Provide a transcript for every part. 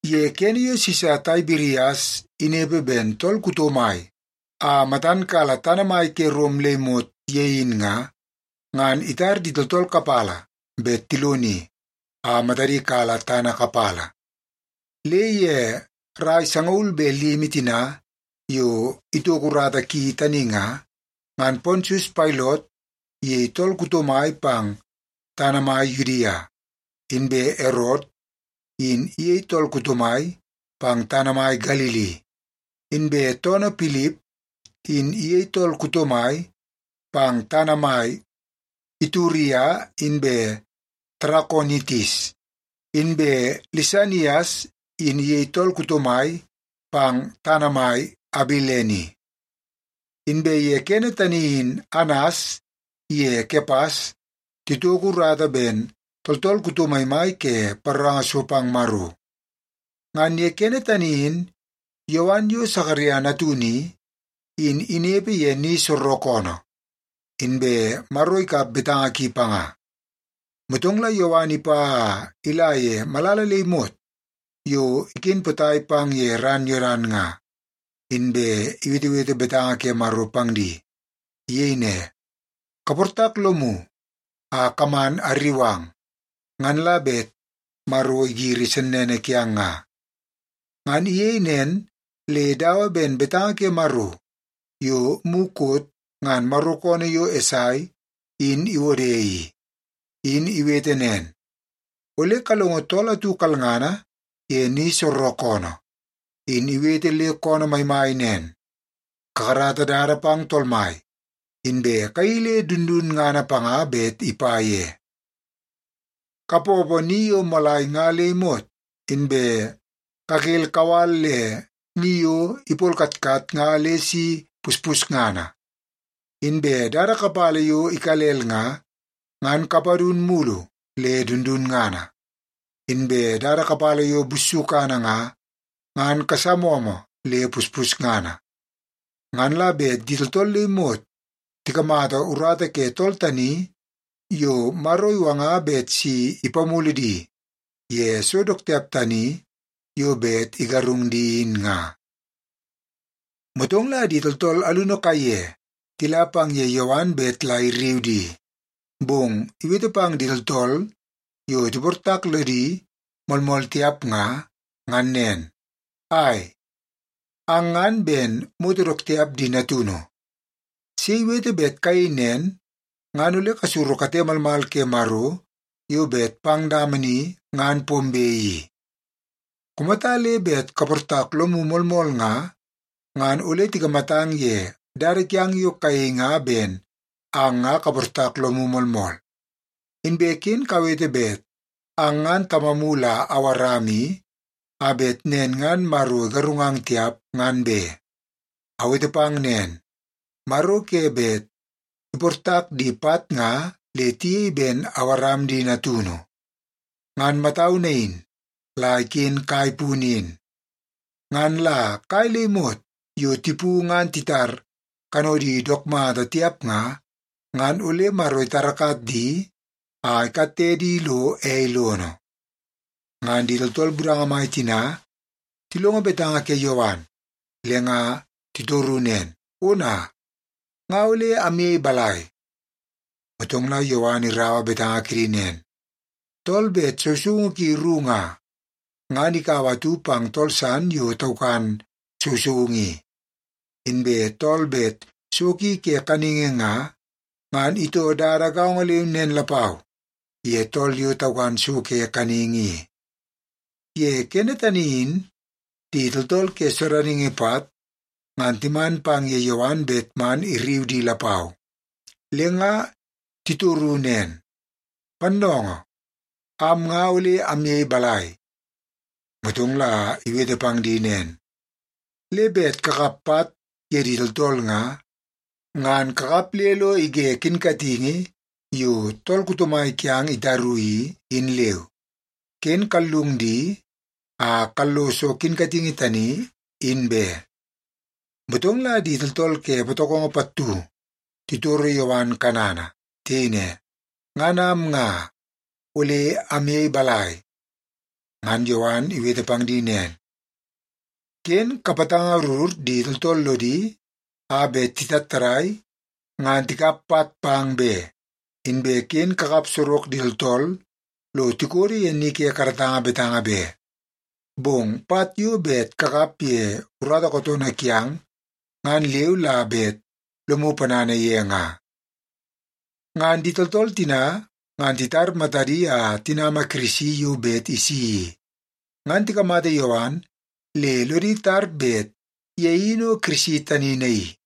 Ye kene yo Sisa Taibirias inepe ben tool kuto mai a matan kala tana maimai ke Rom le imot ye in nga, ngan itar di tooltool kapala bet tiloni a matadi kala tana kapala. Le ye rai sangaul be limi tina yo itoko urata ki tani nga, ngan Pontius Pailot iyei tool kuto mai pang tana mai Yudia, inbe Erot in iyei tool kuto mai pang tana mai Galili, inbe toonoo Pilip in iyei tool kuto mai pang tana mai Ituria inbe Tarakonitis, inbe Lisanias in iyei tool kuto mai pang tana mai Abilene. Inbe ye kene tani in Anas iye Kepas titoko urata ben tooltool kuto maimai ke paroranga so pang Maro. Ngan ye kene tani in Yowan yo Sakaria natunu i, in inepe ye ni soorookoonoo, inbe Maro ikap betanga ki panga. Motong la Yowan ipa a ila ye malala le imot yo iken potai pang ye ran Yodan nga, inbe iwetewete betanga ke Maro pang di. Iyei ne, “Kaportak lomu a kaman arriu ang, ngan la bet Maro igiri sennene kiang nga.” Ngan iyei nen le dawa ben betanga ke Maro yo mukot ngan Maro koonoo yo Esai in iwode i. In iwete nen, “Ole kalongo tool atu kalngana ye ni soorookoonoo, in iwete le koonoo maimai nen, ‘Kakarata dada pang Tool Mai, inbe kayeii le dundunngana panga bet ipa ye. Kapoopoo ni yo moolai nga le imot, inbe kakel kawal le ni yo ipolkatkat nga le si puspusngana. Inbe dada kapala yo ikalel nga, ngan kapadun mulu le dundunngana. Inbe dada kapala yo bussukana nga, ngan kasamomo le puspusngana. Ngan la bet di tooltool le imot tikamata urata ke tool tani yo Maro iwanga bet si ipamulu di ye so dook tiap tani yo bet igarung di in nga.’” Motong la di tooltool alunu kaiye tila pang ye Yowan bet la irriu di. Bong iwete pang di tooltool yo tiportak lodi moolmool tiap nga, ngan nen, “Ai, ang ngan ben moto dook tiap di natunu! Sei iwete bet kayei nen ngan ole kasuru kate malmal ke Maro yo bet pang dama ni ngan pombe i? Kumata le bet kaportak lomu moolmool nga, ngan ole tikamatang ye dada kiang yo kayei nga ben ang nga kaportak lomu moolmool. Inbe ken kawete bet ang ngan tamamu la Awaram i, a bet nen ngan Maro igarungang tiap, ngan be. Awete pang nen, Maro ke bet iportak di pat nga le tiyei ben Awaram di natunu. Ngan matau nain la iken kai punu in. Ngan la kai le imot yo tipu ngan titar kanodi dook mata tiap nga, ngan ole Maro itarakat di a ikatte di lo ei lono.” Ngan di tooltool budanga mai tina tilongo betanga ke Yowan, le nga titoru nen, “Ona, nga ole amyei balai?” Motong la Yowan iraua betanga kidi nen, “Tool bet sousoungu ki ru nga, ngan ikaua atu pang tool san yo taukan sousoungu i. Inbe tool bet so ki ke kaningi nga, ngan itoo dada gaongo leu nen lapau ye tool yo taukan so ke kaningi i.” Ye kene tani in di tooltool ke sodaningi pat ngan timan pang ye Yowan bet man irriu di lapau. Le nga titoru nen, “Pannoongoo, am nga ole amyei balai?” Motong la iwete pang di nen, “Le bet kakap pat ye di tooltool nga, ngan kakap le lo ige kinkatingi yo tool kuto mai kiang itaru i, in leu. Ken kallung di a kalloso kinkatingi tani, in be.” Motong la di tooltool ke patokongo pattu titoro Yowan kanana. Tiyei ne, “Ngan am nga, ole amyei balai?” Ngan Yowan iwete pang di nen, “Ken kapatangarur di tooltool lodi a bet titattadai ngan tikap pat pang be, inbe ken kakap sorok di tooltool lo tikodo ye ni ke karatanga betanga be. Bong pat yo bet kakap ye urata kootoonoo kiang, ngan leu la bet lomu ponana ye nga.” Ngan di tooltool tina ngan titar matadi a tinama Kirisi yo bet isi i, ngan tikamata Yowan le lodi tar bet ye in o Kirisi tani naii.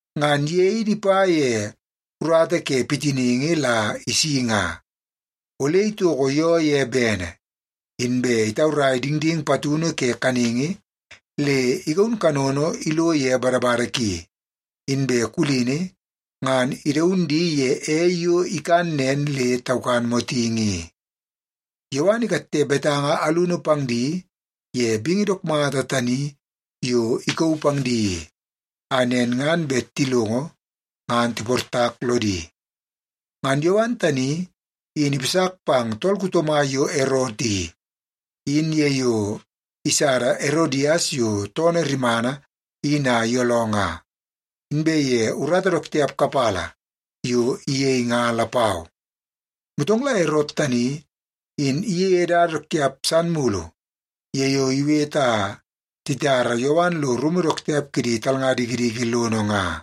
Ngan ye in ipa ye urata ke pitiningi la isi nga. Ole itoko yoo ye bene, inbe itaurai dingding patunu ke kaningi, le igaun kanono ilo ye badabada ki, inbe kulini ngan idaun di ye ei yo ikan nen le taukan motingi i.” Yowan ikatte betanga alunu pang di ye bingi dook mata tani yo ikauu pang di i, a nen ngan bet tilongo ngan tiportak lodi. Ngan Yowan tani in ipasak pang tool kuto mai yo Erot i, in ye yo isada Erodias yo toonoo rimana in a iyooloo nga, inbe ye urata dook tiap kapala yo iyei nga lapau. Motong la Erot tani in iyeie dada dook tiap san mulu ye yo iwete a titara Yowan lo rumu dook tiap kidi talnga dikidiki lono nga.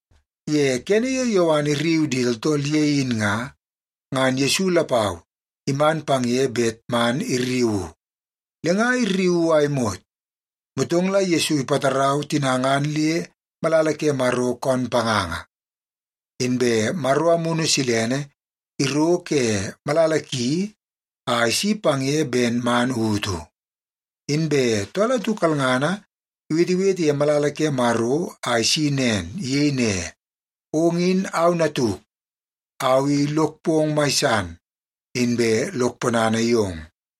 Ye kene yo Yowan irriu di tooltool ye in nga, ngan Yesu lapau iman pang ye bet man irriuu. Le nga irriuu a imot, motong la Yesu ipatarau tina ngan le malala ke Maro koon panganga. Inbe Maro Amunu Silene iro ke malala ki a isi pang ye ben man utu. Inbe tool atu kalngana iwetewete ye malala ke Maro a isi nen. Iyei ne, “Ong in au Natuk. Au i lok pong mai san, inbe lok ponana yong.”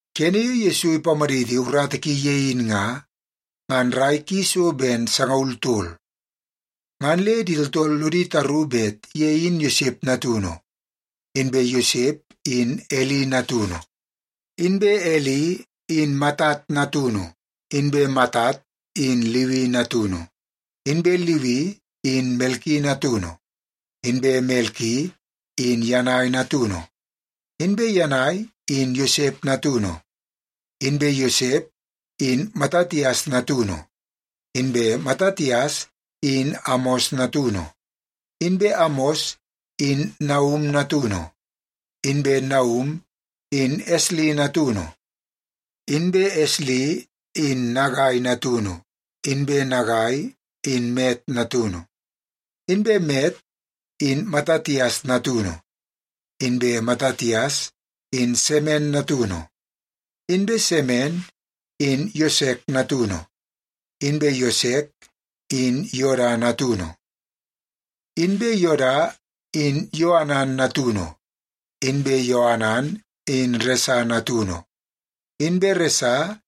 Kene yo Yesu ipamaditi urata ki ye in nga, ngan rai ki so ben sangaul tol. Ngan le di tooltool lodi taru bet ye in Yosep natunu, inbe Yosep in Eli natunu, inbe Eli in Matat natunu, inbe Matat in Liwi natunu, inbe Liwi in Melki natunu, inbe Melki in Yanai natunu, inbe Yanai in Yosep natunu, inbe Yosep in Matatias natunu, inbe Matatias in Amos natunu, inbe Amos in Naum natunu, inbe Naum in Esli natunu, inbe Esli in Nagai natunu, inbe Nagai in Mat natunu, inbe Mat in Matatias natunu, inbe Matatias in Semen natunu, inbe Semen in Yosek natunu, inbe Yosek in Yoda natunu, inbe Yoda in Yoanan natunu, inbe Yoanan in Resa natunu, inbe Resa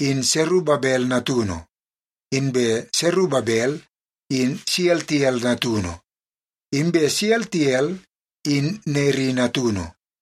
in Serubabel natunu, inbe Serubabel in Sealtiel natunu, inbe Sealtiel in Neri natunu,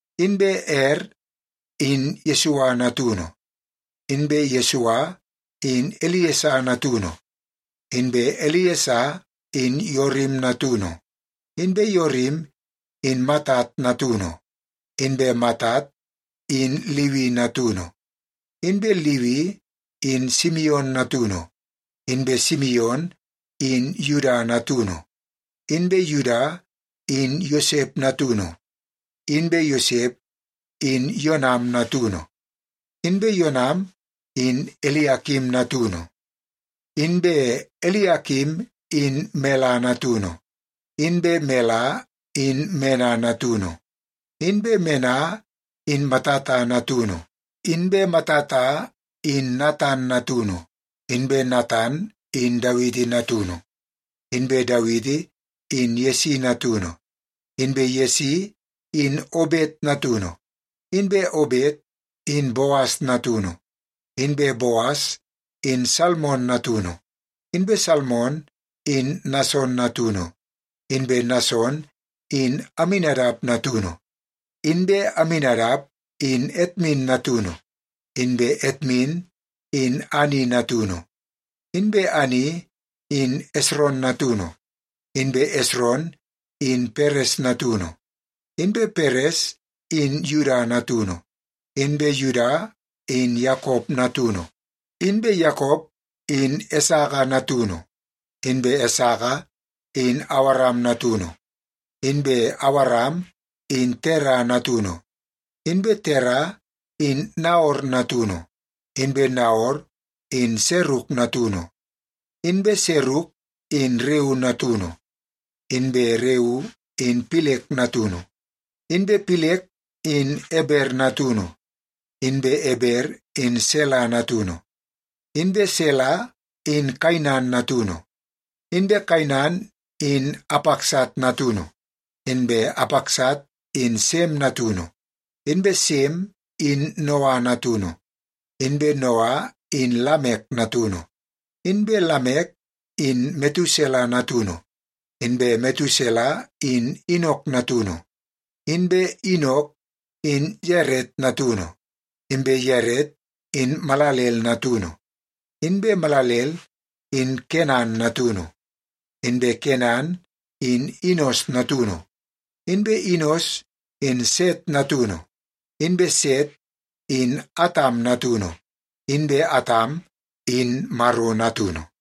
inbe Er in Yesua natunu, inbe Yesua in Eliesa natunu, inbe Eliesa in Yorim natunu, inbe Yorim in Matat natunu, inbe Matat in Liwi natunu, inbe Liwi in Simion natunu, inbe Simion in Yuda natunu, inbe Yuda in Yosep natunu, inbe Yosep in Yonam natunu, inbe Yonam in Eliakim natunu, inbe Eliakim in Mela natunu, inbe Mela in Mena natunu, inbe Mena in Matata natunu, inbe Matata in Natan natunu, inbe Natan in Dawiti natunu, inbe Dawiti in Yesi natunu, inbe Yesi in Obet natunu, inbe Obet in Boas natunu, inbe Boas in Salmon natunu, inbe Salmon in Nason natunu, inbe Nason in Aminadap natunu, inbe Aminadap in Atmin natunu, inbe Atmin in Ani natunu, inbe Ani in Esron natunu, inbe Esron in Peres natunu, inbe Peres in Yuda natunu, inbe Yuda in Yakop natunu, inbe Yakop in Esaka natunu, inbe Esaka in Awaram natunu, inbe Awaram in Tera natunu, inbe Tera in Naor natunu, inbe Naor in Seruk natunu, inbe Seruk in Reu natunu, inbe Reu in Pilek natunu, inbe Pilek in Eber natunu, inbe Eber in Sela natunu, inbe Sela in Kainan natunu, inbe Kainan in Apaksat natunu, inbe Apaksat in Sem natunu, inbe Sem in Noa natunu, inbe Noa in Lamek natunu, inbe Lamek in Metusela natunu, inbe Metusela in Inok natunu, inbe Inok in Yaret natunu, inbe Yaret in Malalel natunu, inbe Malalel in Kenan natunu, inbe Kenan in Inos natunu, inbe Inos in Set natunu, inbe Set in Atam natunu, inbe Atam in Maro natunu.